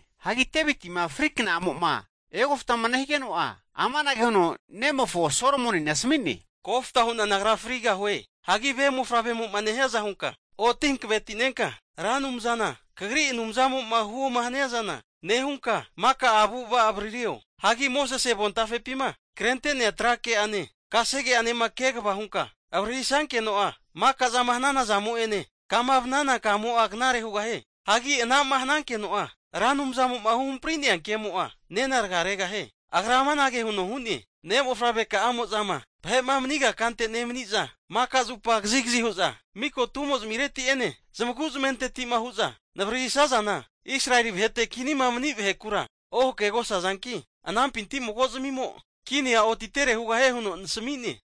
Hagi Devitima fri kna'amo'ma egoftama nehigeno'a, amanage huno nemofo Solomonina asami'ne, Kofta hu'na nagra frigahue. Hagi ve mofavremo'ma nehiaza hunka oti hanavetinenka, Ra Anumzana kagri Anumzamo'ma huoma hania zana nehunka, maka avu'ava'a avaririo. Hagi Mosese avontafepima krente'nea tra ke'ane, kasege'anema kegava hunka avaririsankeno'a, maka zama hanana zamo'ene, kama vanana kamo'a knare hugahie. Hagi ana'ma hanankeno'a Ra Anumzamo'ma huhamprinante'nea kemo'a nena raga regahie. Agra amanage huno hu'ne, Ne' mofavreka'amo'zama vahe'ma maniga kante nemaniza, maka zupa kazigazi hu'za miko tumozimireti'ene, zamagu zamenteti'ma hu'za navaririsazana Israeli vahete'ma kinima mani vahekura ohakegosazanki, kagri mofavre nagapinti mago zimimo kinia otitere hugahie huno nasami'ne.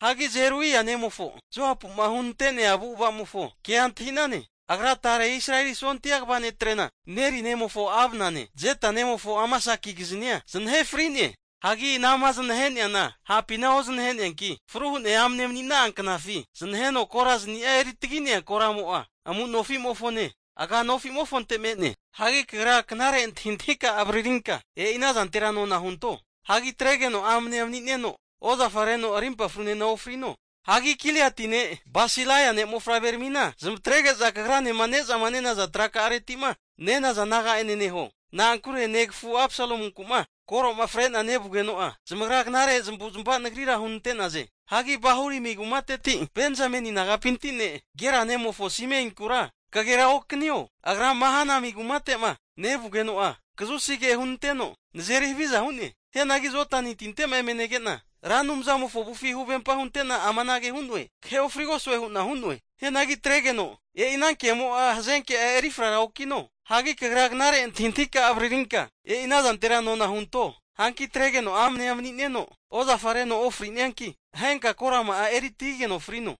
Hagi Zeruia nemofo Joapu'ma hunante'nea avu'avazamofo kea antahi'nane. Agra tare Israeli sondia kva netrena, Neri nemofo Abnane, Jeta nemofo Amasakigiznia zanahe fri'ne. Hagi anama zanahe'neana hapina ozanahe'neanki, fru hu'ne amne mani'na'a knafi zanaheno korazani'a eri tagi'nea koramo'a amu'nofimofone agia anomofonte me'ne. Hagi kagra knare antahintahika'a avaririnka e'ina zantera nona hunto. Hagi atregeno amanea mani'neno ozafa reno rimpa frunena ofrino. Hagi Giliati ne' Basilai ne'mofavreramina zamatrege'za kagranema nezama nenaza traka'areti'ma nenaza naga'ene neho. Na'ankure negafu Absalomunkuma koro'ma fre'na nevugeno'a, zamagra knare zamavu'zamava nagrira hunante'naze. Hagi Bahurimi kumateti Benzameni nagapinti ne' Gera nemofo Simeinkura kagera okanio. Agra Mahanaimi kumate'ma nevugeno'a kazusi ke hunanteno nazeri haviza hu'ne. Hianagi Jodani tinte'ma eme nege'na Ra Anumzamofo avufi huvempa hunte'na amanage hu'noe, Kahe ofrigosue hu'na hu'noe. Hianagi atregeno e'ina kemo'a hazenke'a erifrara okino. Hagi kagra knare antahintahika'a avaririnka e'ina zantera nona hunto. Hanki atregeno amanea mani'neno ozafa reno ofri'nianki, ahenka korama'a eri tagigeno frino.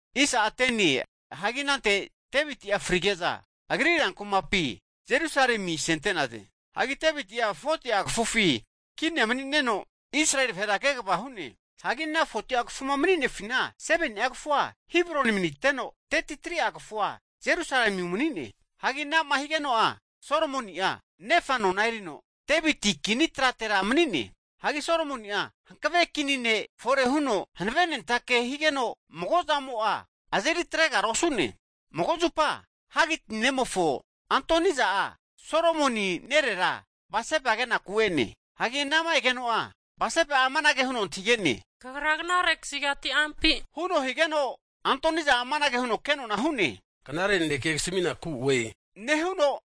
Hagi anante Deviti'a frige'za agri rankumapi Jerusalemi asente'naze. Hagi Deviti'a 40'a kafufi kinia mani'neno, Israeli vahera kegava hu'ne. Hagi ana 40'a kafuma mani'nefina 7ni'a kafua Hebroni maniteno, 33'a kafua Jerusalemi umani'ne. Hagi anama higeno'a Solomoni'a nefa nona erino Deviti kini tratera kinia mani'ne. Hagi Solomoni'a hankave kini ne' fore huno hanavenentake higeno magozamo'a azeri atregara osu'ne. Mago zupa Hagiti ne'mofo Adoniza'a Solomoni nerera Batseba kenaku e'ne. Hagi anama egeno'a, Batseba'a amanage huno antahige'ne. Kagra knare kazigati ampi? huno higeno, Adoniza'a amanage huno kenona hu'ne, Knare naneke kasaminaku oe nehuno,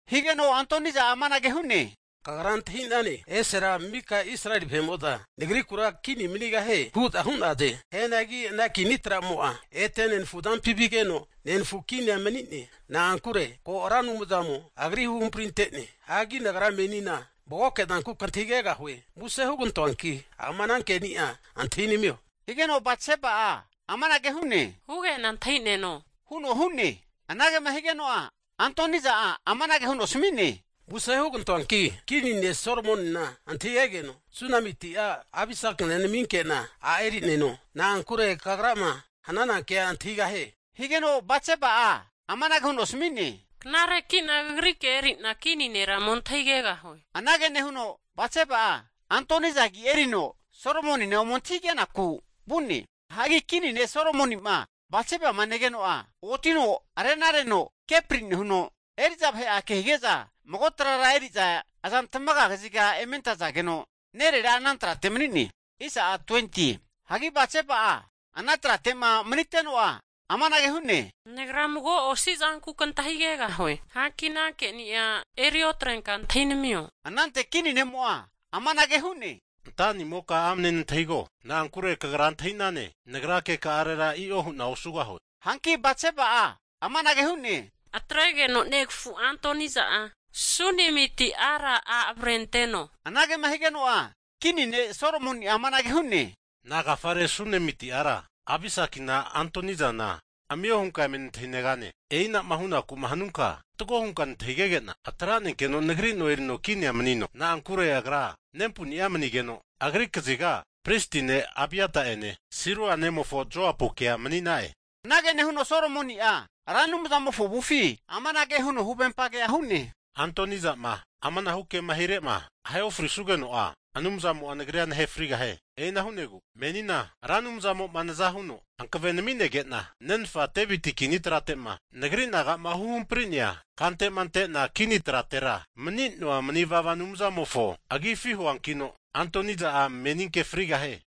Higeno Adoniza'a amanage hu'ne, Kagra antahi'nane, esera mika Israeli vahe'mo'za nagriku kini manigahie hu'za hu'naze. Hianagi ana kini tramo'a ete nenafu azampi vigeno, nenagna kinia manie. Na'ankure ko Ra Anumzamo agri huhamprinte'ne. Hanki nagra menina magoke zanku kantahigegahue. Muse hugantoanki ama ana keni'a antahinamio, higeno Batseba'a amanage huno hu'ne, Hugena antahineno huno hu'ne. Anagema higeno'a Adoniza'a amanage huno asami'ne, Muse hugantoanki kini ne' Solomonina antahigegeno, Sunamiti a' Abisakina naminkena a' eri'neno. Na'ankure kagrama hananankea antahigahie. Higeno Batseba'a amanage huno asami'ne, Knareki'na kagri kea eri'na kini nera ome antahigegahue. Anage nehuno Batseba'a Adoniza agi erino Solomonina ome antahigenaku vu'ne. Hagi kini ne' Solomoni'ma Batsebama negeno'a, otino arena reno kepri nehuno, eri'za vahe'a kehige'za mago trara eri'za azantmaga kaziga eme antazageno, nerera'a ana trate mani'ne. Hagi Batseba'a ana trate'ma maniteno'a amanage hu'ne, Nagra mago osi zanku kantahigegahue, hanki ana keni'a eri otrenka antahinamio. Anante kini ne'mo'a amanage hu'ne. Antanimoka amne nantahigo, na'ankure kagra antahi'nane, nagra keka'arera i'o hu'na osugahue. Hanki Batseba'a amanage hu'ne, Atregeno negafu Adoniza'a Sunemiti ara a' avrenteno. Anagema higeno'a kini ne' Solomoni'a amanage hu'ne, Nagafare Sunemiti ara Abisakina Adonizana amio hunka eme nantahinegane? E'ina'ma hunaku'ma hanunka fatgo hunka nantahigege'na atranenkeno nagri no erino kinia manino. Na'ankure agra nempuni'a manigeno agri kaziga pristi ne' Abiata'ene, Seruia nemofo Joapukea mani'na'e. Anage nehuno Solomoni'a Ra Anumzamofo avufi amanage huno huvempagea hu'ne. Adoniza'ma amanahu ke'ma hire'ma ahe ofrisugeno'a Anumzamo'a nagrira nahe frigahie! E'ina hu'negu menina Ra Anumzamo'ma naza huno hankave naminege'na nenfa Deviti kini trate'ma nagri naga'ma huhampri'nea kante'ma ante'na kini tratera mani'ne'na mani vava Anumzamofo agifi huankino, Adoniza'a meninke frigahie.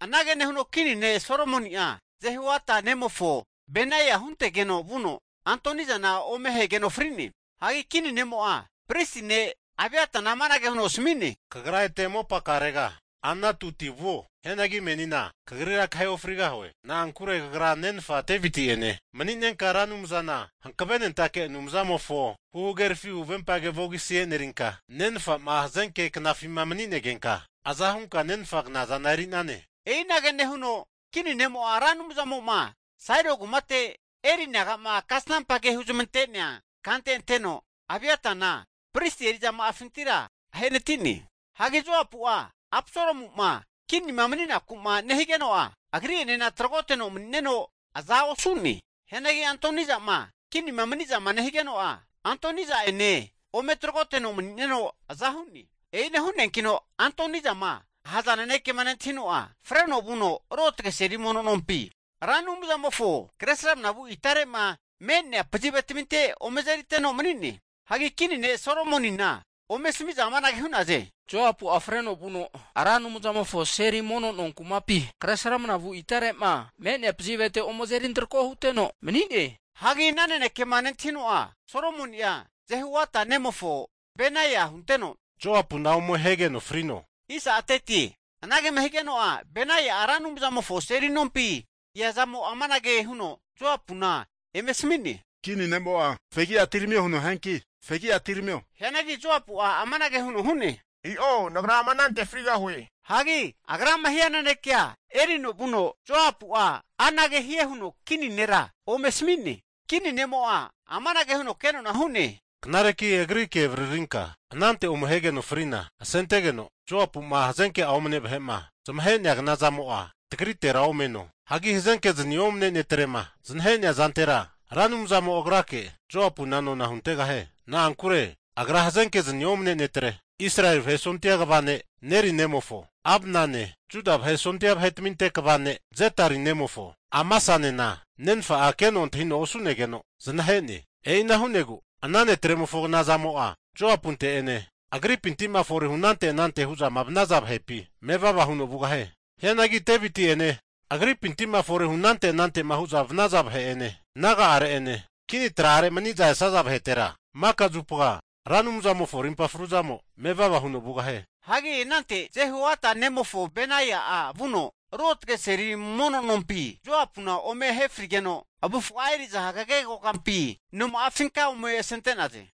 Anage nehuno kini ne' Solomoni'a Jehoiada nemofo Benaia huntegeno vuno, Adonizana ome ahegeno fri'ne. Hagi kini ne'mo'a pristi ne' Abiatana amanage huno asami'ne, kagra ete mopakarega Anatoti vuo. Hianagi menina kagrira kahe ofrigahue. Na'ankure kagra nenfa Deviti'ene mani'nenka Ra Anumzana hankavenentake Anumzamofo huhagerafi huvempage vogisi e'nerinka, nenfa'ma hazenke knafima mani'negenka aza hunka nenfa knazana eri'nane. E'inage nehuno kini ne'mo'a Ra Anumzamo'ma Sailo kumate Eli naga'ma kasnampa ke huzamante'nea kante anteno Abiatana pristi eri'zama'afintira ahenati'ne. Hagi Joapu'a Absalomu'ma kinima mani'naku'ma nehigeno'a agri'enena tragoteno mani'neno aza osu'ne. Hianagi Adoniza'ma kinima mani'zama nehigeno'a, Adoniza'ene ome tragoteno mani'neno aza hu'ne. E'ina hu'neankino Adonizama ahaza nanekema nentahino'a, freno vuno ruotge seli mono nompi Ra Anumzamofo kre sramnavu itare'ma me'nea pazivetaminte ome azeriteno mani'ne. Hagi kini ne' Solomonina ome asami'za amanage hu'naze, Joapu'a freno vuno Ra Anumzamofo seli mono no kumapi kre sramnavu itare'ma me'nea pazivete ome azerintrako huteno mani'ne. Hagi ana nanekema nentahino'a Solomoni'a Jehoiada nemofo Benaia hunteno, Joapuna ome ahegeno frino! Anagema higeno'a Benaia'a Ra Anumzamofo seli nompi eazamo amanage huno Joapuna eme asami'ne, Kini ne'mo'a fegi atiramio huno hianki fegia atiramio. Hianagi Joapu'a amanage huno hu'ne, I'o nagra ama anante frigahue. Hagi agrama hia nanekea erino vuno Joapu'a anage hie huno kini nera ome asami'ne. Kini ne'mo'a amanage huno kenona hu'ne, Knareki agri ke avaririnka anante ome ahegeno frina asentegeno Joapu'ma hazenke'a omane vahe'ma zamahe'nea kanazamo'a tagritera omaneno. Hagi hazenkezani omne netrema zanahe'nea zantera, Ra Anumzamo agrake Joapuna nona huntegahie. Na'ankure agra hazenkezni omne netre Israeli vahe sondia kva ne' Neri nemofo Abnane, Juda vahe sondia vahetaminte kva ne Jetari nemofo Amasanena nenfa'a keno antahino osu'negeno zanahe'ne. E'ina hu'negu ana netremofo knazamo'a Joapunte'ene agripinti'ma forehu anante anante hu'zama vanaza vahepi mevava huno vugahie. Hianagi Devitinte'ene agripinti'ma forehu anante anante'ma hu'za vanaza vahe'ene, naga'are'ene, kini tra'are mani'za esaza vahetera maka zupa Ra Anumzamofo arimpa fruzamo mevava huno vanie. Hagi anante Jehoiada nemofo Benaia'a vuno ruotge seli mono nompi Joapuna ome ahe frigeno, avufa'a eri'za hagege kokampi noma'afinka ome asente'naze.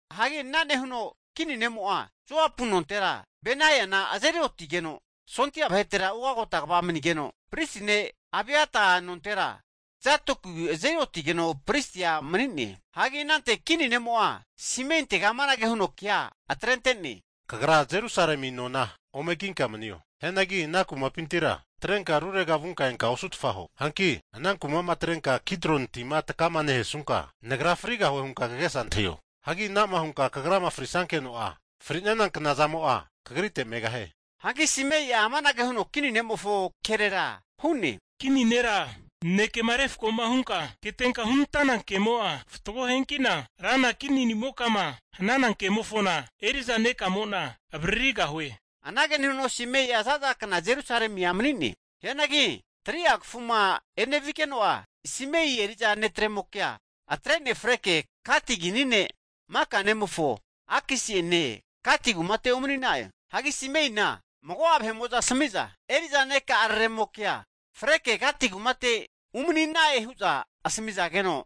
Hagi ana nehuno kini ne'mo'a Joapu nontera Benaiana azeri otigeno sondia vahetera ugota kva manigeno, pristi ne' Abiata nontera, Zadoki azeri otigeno pristia mani'ne. Hagi anante kini ne'mo'a Simeintega amanage huno kea atrente'ne, kagra Jerusalemi nona ome kinka manio. Hianagi ana kumapintira atrenka rurega vunka enka osutfa huo. Hanki ana kuma'ma atrenka Kidroni kraho'ma agaterenka nevanunka, nagra frigahue hunka kagesa antahio. Hagi anama hunka kagrama frisankeno'a, fri'nana knazamo'a kagrite megahie. Hanki Simei'a amanage huno kini ne'mofo kerera hu'ne, kini nera nanekema refko'ma hunka ketenka hunantana kemo'a fatgo hianki'na rana kini nimokama hanankemofona, eri'za nekamo'na avaririgahue. Anage nehuno Simei'a zaza kna Jerusalemia mani'ne. Hianagi 3'a kafuma enevigeno'a, Simei eri'za netremokea atrene freke Gati kini ne' Maka nemofo Akisi'ene Gati kumate umani'na'e. Hagi Simeina mago'a vahe'mo'za asami'za, Eri'za neka'araremokea freke Gati kumate umani'na'e huza asamizageno,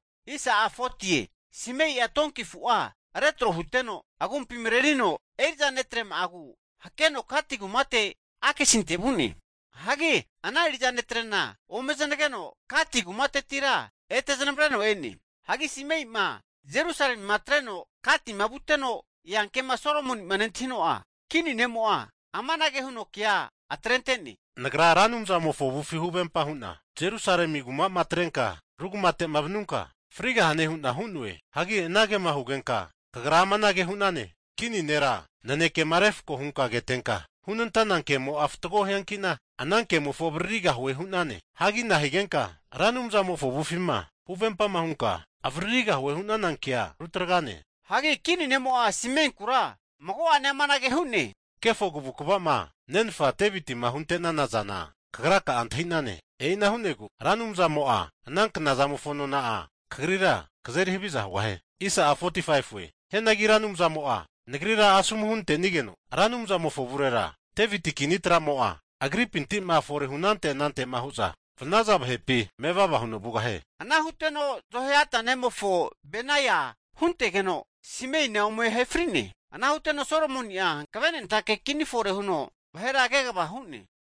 Simei'a tonki afu'a retro huteno agumpi marerino eri'za netrema'agu hakeno Gati kumate Akisinte vu'ne. Hagi ana eri'za netre'na ome zanageno, Gati kumatetira ete zanavreno e'ne. Hagi Simei'ma Jerusalemima atreno Gatima vuteno eankema Solomoni'ma nentahino'a, kini ne'mo'a amanage huno kea atrente'ne, Nagra Ra Anumzamofo avufi huvempa hu'na Jerusalemi kuma'ma atrenka ru kumate'ma vanunka frigahane hu'na hu'noe. Hagi anagema hugenka, kagra amanage hu'nane, kini nera nanekema refko'ma hunka ketenka hunantana kemo'a fatgo hianki'na ana kemofo avaririgahue hu'nane. Hagi nahigenka Ra Anumzamofo avufima huvempama hunka avaririgahue hu'nana kea rutragenane? Hagi kini ne'mo'a Simeinkura mago'ane amanage hu'ne, kefo kavukava'ma nenfa Devitima hunte'nana zana kagra'a antahi'nane. E'ina hu'negu Ra Anumzamo'a ana knazamofo nona'a kagrira kazeri haviza hugahie. Hianagi Ra Anumzamo'a nagrira asomu hunante'nigeno, Ra Anumzamofo avurera Deviti kini tramo'a agripintima fore hunante anante'ma hu'za vanaza vahepi mevava huno vugahie. Ana huteno Jehoiada nemofo Benaia huntegeno, Simeina ome ahe fri'ne. Ana huteno Solomoni'a hankavenentake kini fore huno vahera kegava hu'ne.